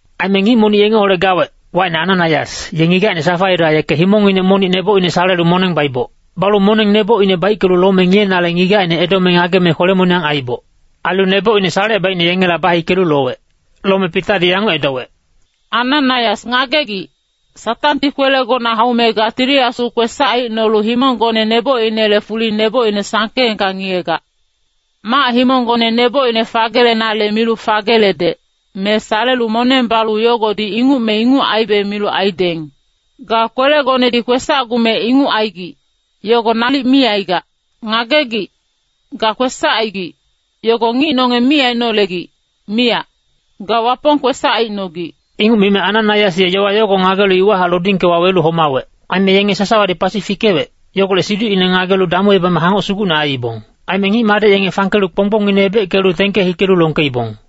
Aime ngic monic yengeholec gawec, wacine Ananaias, ye ngigacine Safaira yeke himongnginec monic nebocine salelu moneng baiboc. Balu moneng nebocine baickelu lome ngiyenale ngigacine edome ngageme kwele-moniyang aiiboc. Ailu nebocine salecebaicne yengela bahikelu lowec. Lome Pitadi yanguc edowec, “Ananaias ngagegic, Satangti kwelegona haume ga Tili Asu kwesac aicnolu himonggone nebocinele fuli nebocine sangkeengka ngiyegac. Mac-himonggone nebocine fagelenale milu fageledec, me salelu moneng balu yogodi inguc me inguc aibe milu aideng. Ga kwelegonedi kwesacgume inguc aigic, yogo nalic mi aigac. Ngagegic, ga kwesac aigic, yogo ngic nonge mi ainolegic, miyac. Ga Wapong kwesac aicnogic.” Inguc mime Ananaias ye yowa yogo ngagelu iwahac lodingke wawelu homawec. Aime yenge sasawadi pasi fikewec, yogolec siducine ngagelu damuebame hangoc sugucne aiibong. Aime ngic-madec yenge fangkelu kponggbongine ebeckelu tengke hikelu longkeibong.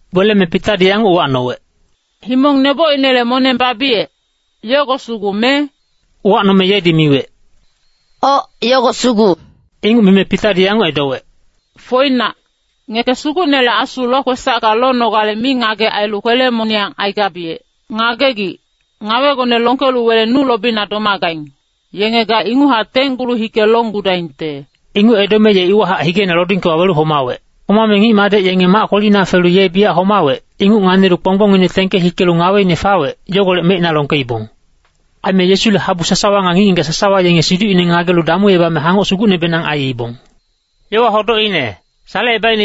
Weleme Pitadi yanguc uwacnowec, “Himong nebocinele moneng babiyec, yogo sugu me?” Uwacnome yedi miwec, “Oc, yogo sugu.” Inguc mime Pitadi yanguc edowec, “Foinac, ngeke Sugucnele Asu lokwesacka lonogale mingagec ailu kwele-moniyang aigabiyec. Ngagegic, ngawegone longkelu wele nu lobina domagaing, yenge ga inguchac tenggulu hike longgudaingte.” Inguc edome ye iwahac higeina lodingke wawelu homawec. Homame ngic-madec yenge mac kwelina felu ye biyac homawec, inguc nganilu kponggbongine tengke hikelu ngaweine fawec, yogolec mecina longkeibong. Aime Yesule habu sasawa nga ngic-ngigac sasawa yenge siducnginec ngagelu damuebame hangoc sugucnebenang aiibong. Salecebaicne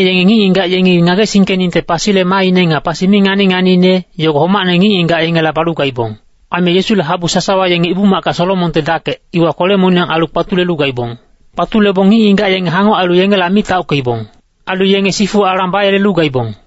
yenge ngic-ngigac yengi ngagesingkeningte pasile maaine nga pasi mi ngani-nganiine, yogo homacne ngic-ngigac yengela balu gaibong. Aime Yesule habu sasawa yenge Ibu-macka Solomonte Dakec, iwa kwele-moniyang ailu kpatulelu gaibong. Kpatulebong ngic-ngigac yenge hangoc ailu yengela mi taockeibong. Ailu yenge sifu alang bayelelu gaibong.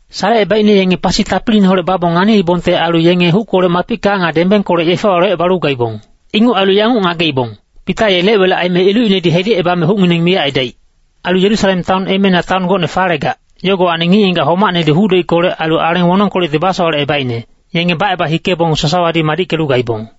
Salecebaicne yenge pasi tapiliineholec babong nganiibongte ailu yenge huckolec mapicka nga dembengkolec yefewa locebalu gaibong. Inguc ailu yanguc ngageibong, Pita ye lec-welec aime ilucinedi hedicebame hucngineng miyac aidaic. Ailu Yerusalem taon emeina taon gocne falegac, yogowacni ngic-ngigac homacnedi huc-doickolec ailu aleng wonongkolecti basowalecebaicne, yenge baceba hikebong sasawadi madickelu gaibong.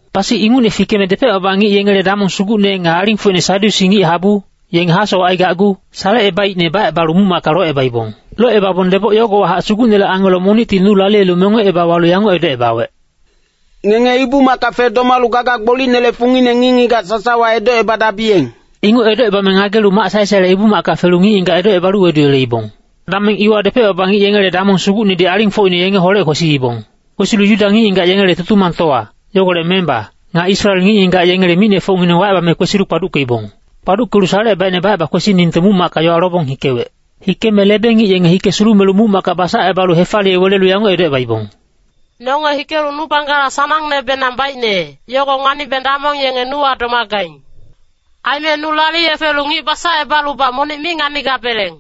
Pasi ingucne fikeme depec-baba ngic yengele damong sugucne nga alingfocine Sadyusi ngic-habu, yenge hasowac aigacgu salecebaicne bacebalu muc-macka locebaibong. Locebabong deboc yogowahac Sugucnele angelo monicti nu laliyelu mengoceba walu yanguc edocebawec, “Ngenge Ibu-macka fedomalu gaga gbolicnele fungine ngic-ngigac sasawa edocebadabiyeng.” Inguc edocebame ngagelu mac sae-saele Ibu-macka felu ngic-ngigac edocebalu weduyeleibong. Dameng iwa depec-baba ngic yengele damong sugucnedi alingfocine yengeholec kwesiibong. Kwesilu Yuda ngic-ngigac yengele Tutumangtowa, yogolec memba, nga Israel ngic-ngigac yengele micnefocngineng wacebame kwesilu kpaduckeibong. Kpaduckelu salecebaicne baceba kwesiningte muc-macka yowa lobong hikewec. Hikeme lebe-ngic yenge hike sulumelu muc-macka basacebalu hefaliye welelu yanguc edocebaibong, “Nonge hikelu nu panggala sanangnebenang baicne, yogo nganibeng damong yenge nuwa domagaing. Aime nu laliye felu ngic basacebalubac monic mi nganigabeleng.”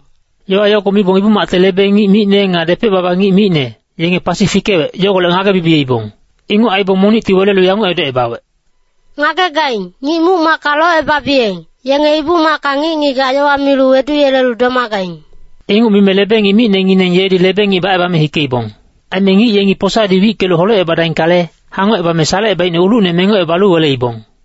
Yowa yogo mibong Ibu-macte lebe-ngic micne nga depec-baba ngic micne, yenge pasi fikewec, yogolec ngage-bibiyeibong. Inguc aibong monicti welelu yanguc edocebawec, “Ngagegaing, ngic muc-macka locebabiyeng, yenge Ibu-macka ngic-ngigac yowa milu weduyelelu domagaing.” Inguc mime lebe-ngic micnengineng yedi lebe-ngic bacebame hikeibong. Aime ngic yengi posadi wickelu holecebadaingkale, hangocebame salecebaicne ulucne mengocebalu weleibong.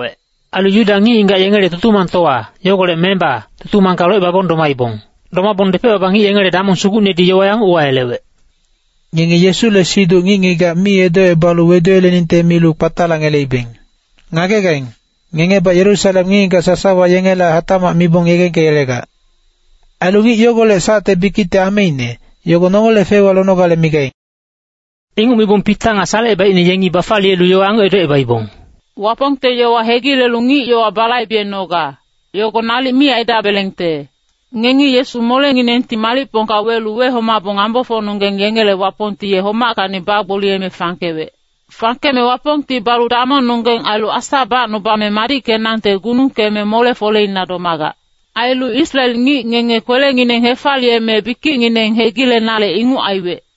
Ailu Yuda ngic-ngigac yengele Tutumangtowa, yogolec memba tutumangka locebabong domaibong. Domabong depec-baba ngic yengele damong sugucnedi yowa yanguc uwayelewec, “Ngenge Yesule siduc ngic-ngigac mi edocebalu weduyeleningte milu kpatalacngeleibeng. Ngagegaing, ngengebac Yerusalem ngic-ngigac sasawa yengela hatacmac mibong yegengkeyelegac. Ailu ngic yogolec sacte bikicte ameine, yogo nongele feiwa lonogale migaing.” Inguc mibong Pita nga salecebaicne yengi bafaliyelu yowa yanguc edocebaibong, “Wapongte yowa hegilelu ngic-yowa balaibenoga, yogo nalic mi aidabelengte. Ngengi Yesu molenginengti malicpongka welu wehomabong ngambofocnonggeng yengele Wapongti ye homackacni bagboliyeme fangkewec. Fangkeme Wapongti balu damongnonggeng ailu Asa bacnubame madickenangte gunungkeme mole-foleina domagac. Ailu Israel ngic ngenge kwelengineng hefaliyeme bikicngineng hegilenale inguc aiwec.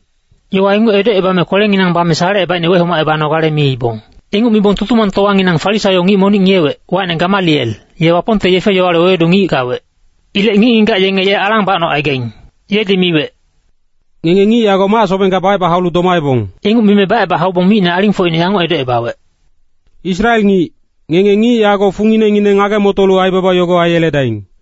Yowa inguc edocebame kwelenginang bame salecebaicne wehomacebanogale miibong. Inguc mibong Tutumangtowanginang Farisaio ngic monic ngiyewec, wacine Gamaliel, ye Wapongte yefe-yowale wewedu ngic gawec. Ilec ngic-ngigac yenge ye alang bacnocaigaing. Yedi miwec, “Ngenge ngic yago mac-sobengka baceba haulu domaebong.” Inguc mime baceba haubong micne alingfocine yanguc edocebawec, “Israel ngic, ngenge ngic yago funginengineng ngage-motolu aibaba yogo aiyeledaing.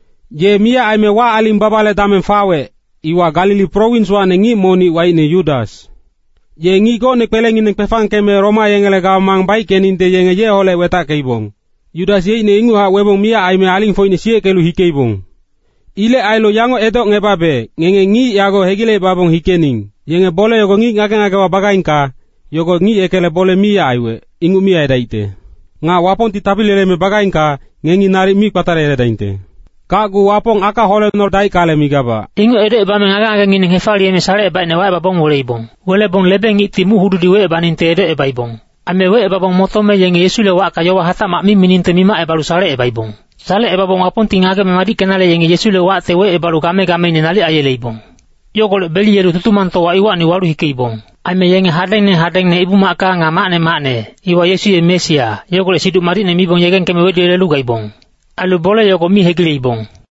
Ye miyac aime wac-aling babale dameng fawec, iwa Galili prowinswacni ngic monic wacine Yudas, ye ngic gocne kwelengineng kwefangkeme Roma yengele gamang baickeningte yenge yeholec wetackeibong. Yudas yeicne inguchac webong miyac aime alingfocine siyeckelu hikeibong. Ilec ailu yanguc edocngebabe, ngenge ngic yago hegilecebabong hikening. Yenge bole yogo ngic ngage-ngagewa bagaingka, yogo ngic yekele bole miyac aiwec, inguc miyac aidaicte. Nga Wapongti tapili yeleme bagaingka, ngengi nalic mi kpatalayeledaingte. Gacgu Wapong aka holecnodaingkale migabac.” Inguc edocebame ngage-ngagengineng hefaliyeme salecebaicne wacebabong weleibong. Welebong lebe-ngicti muc-hududi wecebaningte edocebaibong. Aime wecebabong motome yenge Yesule wacka yowa hatacmac mi miningte mimacebalu salecebaibong. Salecebabong Wapongti ngageme madickenale yenge Yesule wacte wecebalu game-gameine nalic aiyeleibong. Yogolec beliyelu Tutumangtowa iwacni walu hikeibong. Aime yenge hadengne hadengne Ibu-macka nga macne macne, iwa Yesu ye Mesia, yogolec Siduc Madicne mibong yegengkeme weduyelelu gaibong. Ailu bole yogo mi hegileibong.